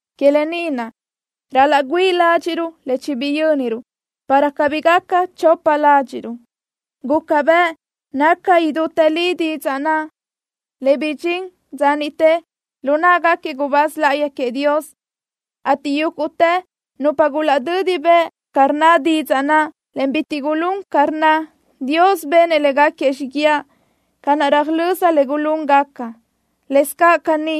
Que lë ni naʼ, ral-laʼ güíʼi ládxiʼröruʼ le chibiyö́niruʼ, para cabí gaca chopa ládxiʼruʼ. Guca bëʼ naca idútë li didzaʼ naʼ, le bidxín dza niʼte lu náʼagaquiëʼ gubáz láʼayi queëʼ Dios, ateʼ yúguʼtë nupa gulaʼdödi bëʼ ca rnna didzaʼ naʼ, en bitiʼ gulún ca rnna, Dios benëʼ léguequi xíguiaʼ ca naʼ röjlö́z le gulúngaca. Lëscaʼ caní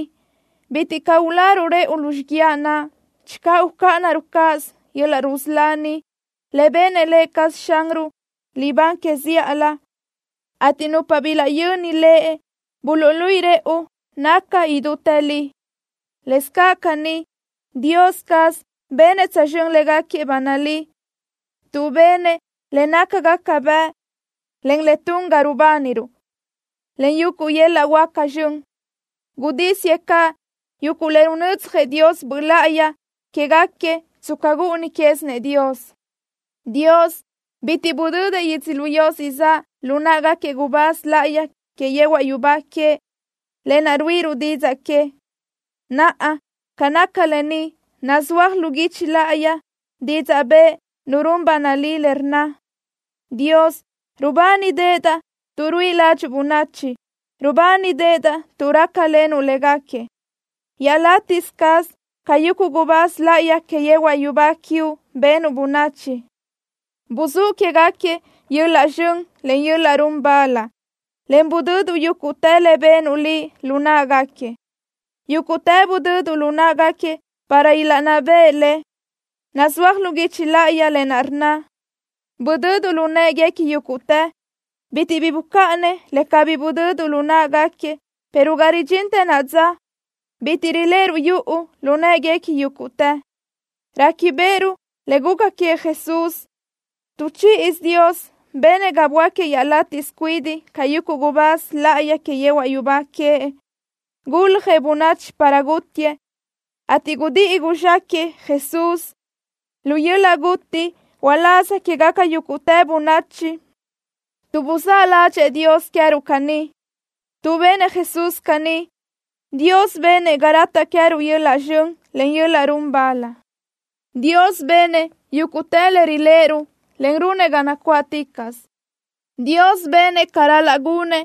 bitiʼ caʼ uláruʼ rëʼu lu xíguiaʼ naʼ channö ucáʼanaruʼ cáʼasö yöl-laʼ rusölá ni, le benëʼ Lë cazëʼ Xanruʼ libán que zíʼalö, ateʼ nupa bilaʼyöni Lëʼ buluʼluíʼi rëʼu naca idútë li. Lëscaʼ caní Dios caz benëʼ tsözxö́n légaquiëʼ ba nalí, tuʼ benëʼ le nácagaca bëʼ, en le tun ga rubániruʼ, en yuguʼ yöl-laʼ huáca zxön. Gudísiëʼ caʼ yuguʼ le runödzjëʼ Dios Böʼ Láʼayi quégaquiëʼ tsca gúʼuni quézinëʼ Dios. Dios bitiʼ budödëʼ yödzölió siʼ zaʼ lu náʼagaquiëʼ gubáz láʼayi que yehuaʼ yubá queëʼ, lë naʼ ruíʼiruʼ didzaʼ que. Naʼa, ca naca lë ni, nazúaj lu guichi láʼayi didzaʼ bëʼ nu run ba nalí le rnna: Dios, rubánideʼedaʼ tuʼ ruíʼi ládxuʼu bönachi. Rubánideʼedaʼ tuʼ rácalenuʼ léguequi. Iaʼlátiʼsö cáʼasö ca yuguʼ gubáz láʼayi que yehuaʼ yubá quiuʼ benuʼ bönachi. Buzúʼ quéguequi yöl-laʼ zxön, en yöl-laʼ run bal, en budöduʼ yúguʼtë le benuʼ Liʼ lu në́ʼeguequi. Yúguʼtë budöduʼ lu në́ʼeguequi para ilaʼnná beʼe le. Nazúaj lu guichi láʼayi lë naʼ rnna: “Budöduʼ lu në́ʼeguequi yúguʼtë.” Bitiʼ bi bucáʼanëʼ le cabí budödëʼ lu në́ʼeguequi, pero ga ridxintë naʼa dza, bitiʼ riléʼeruʼ yuʼu lu në́ʼeguequi yúguʼtë. Réquibeʼeruʼ le guca queëʼ Jesús. Tu chíʼisö, Dios benëʼ ga böáquiëʼ iaʼlátiʼsö cuidiʼ ca yuguʼ gubáz láʼayi que yehuaʼ yubá queëʼ. Guljëʼ bönachi para gútiëʼ, ateʼ gudíʼi guzxáquëʼë Jesús lu yöl-laʼ guti uláz quégaca yúguʼtë bönachi, tuʼ buzáʼ ládxëʼë Dios queë́ruʼ caní. Tuʼ benëʼ Jesús caní, Dios benëʼ ga rataʼ queëruʼ yöl-laʼ zxön, en yöl-laʼ run bal. Dios benëʼ yúguʼtë le riléʼeruʼ, en runëʼ ga nacuáʼticaʼsö. Dios benëʼ ca ral-laʼ gunëʼ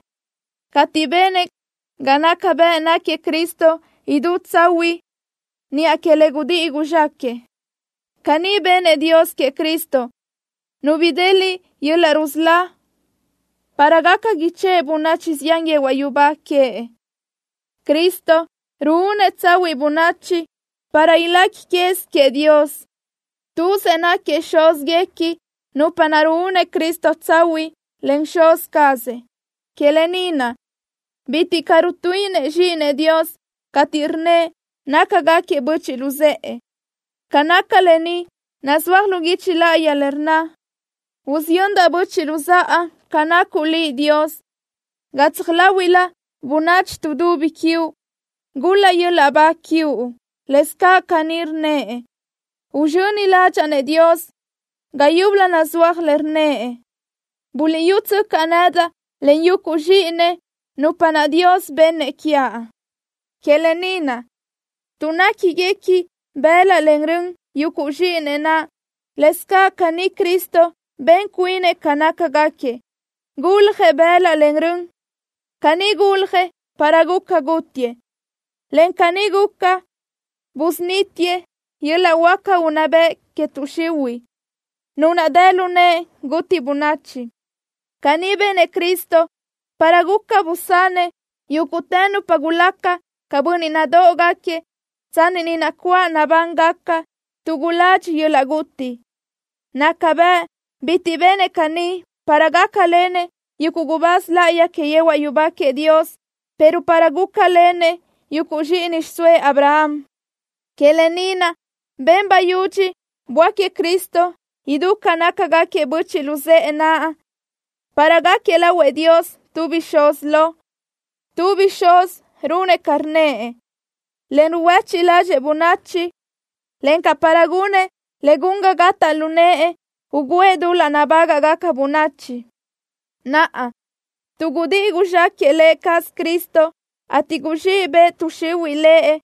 cateʼ benëʼ ga naca bëʼ náquiëʼ Cristo idú tsahuiʼ niʼa que le gudíʼi guzxáquëʼë. Caní benëʼ Dios queëʼ Cristo, Nu bideliʼ yöl-laʼ rusölá para gaca ichë́ʼë bönachi zián yehuaʼ yubá queëʼ. Cristo ruúnëʼ tsahuiʼ bönachi para ilequi quez queëʼ Dios. Tuzëʼ náquiëʼ Xúzguequi nupa naʼ ruúnëʼ Cristo tsahuiʼ, en Xuz cazëʼ. Que lë ni naʼ, bitiʼ caʼ rutuíʼinëʼ Zxíʼinëʼ Dios cateʼ rnnëʼ nácagaquiëʼ böchiʼ luzë́ʼë. Ca naca lë ni nazúaj lu guichi láʼayi le rnna: Usiyöndaʼ böchiʼ luzáʼa ca nacuʼ Liʼ, Dios. Gatsaj láhuiʼlö bönachi tuʼdubi quiuʼ, gul-laʼ yöl-laʼ ba quiuʼ. Lëscaʼ caní rnnëʼ: Uzxöni ládxaʼa-nëʼ Dios. Ga yúbölö nazúaj le rnnëʼ: ¡Buliʼyútsöcaʼ nedaʼ, en yuguʼ zxíʼinëʼ, nupa naʼ Dios bennëʼ quiaʼ! Que lë ni naʼ, tuʼ néquiguequinëʼ bëlaʼ en rön yuguʼ zxíʼinëʼ naʼ, lëscaʼ caní Cristo ben cuinëʼ ca nácagaquiëʼ. Guljëʼ bëlaʼ en rön. Caní guljëʼ para guca gútiëʼ, en caní guca busunítiëʼ yöl-laʼ huáca unná bëʼ que tuʼ xihuiʼ, nu naʼ dë lu nëʼe guti bönachi. Caní benëʼ Cristo para guca busanëʼ yúguʼtë nupa gulaca ca bönniʼ nadóʼogaquiëʼ tsanni ni nacuáʼ nabángaca, tuʼ guladxi yöl-laʼ guti. Naca bëʼ bitiʼ benëʼ caní para gácalenëʼ yuguʼ gubáz láʼayi que yehuaʼ yubá queëʼ Dios, pero para gúcalenëʼ yuguʼ zxíʼini xiʼsóëʼ Abraham. Que lë ni naʼ, ben bayudxi böáquiëʼ Cristo idú ca nácagaquiëʼ böchiʼ luzë́ʼë naʼ, para gáquiëʼ lahuëʼ Dios tu bixúz lo, tu bixúzi runëʼ ca rnnëʼ, en ruhuéchiʼ ládxëʼë bönachi, encaʼ para gunëʼ le gun ga gataʼ lu nëʼë ugǘëʼ dul-laʼ nabágaʼgaca bönachi. Naʼa, tuʼ gudíʼi guzxáquëʼë Lë cazëʼ Cristo, ateʼ guzxíʼ bëʼ tuʼ xihuiʼ Lëʼ,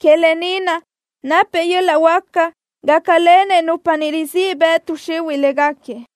que lë ni naʼ napëʼ yöl-laʼ huáca gácalenëʼ nupa ni, rizíʼ bëʼ tuʼ xihuiʼ léguequi.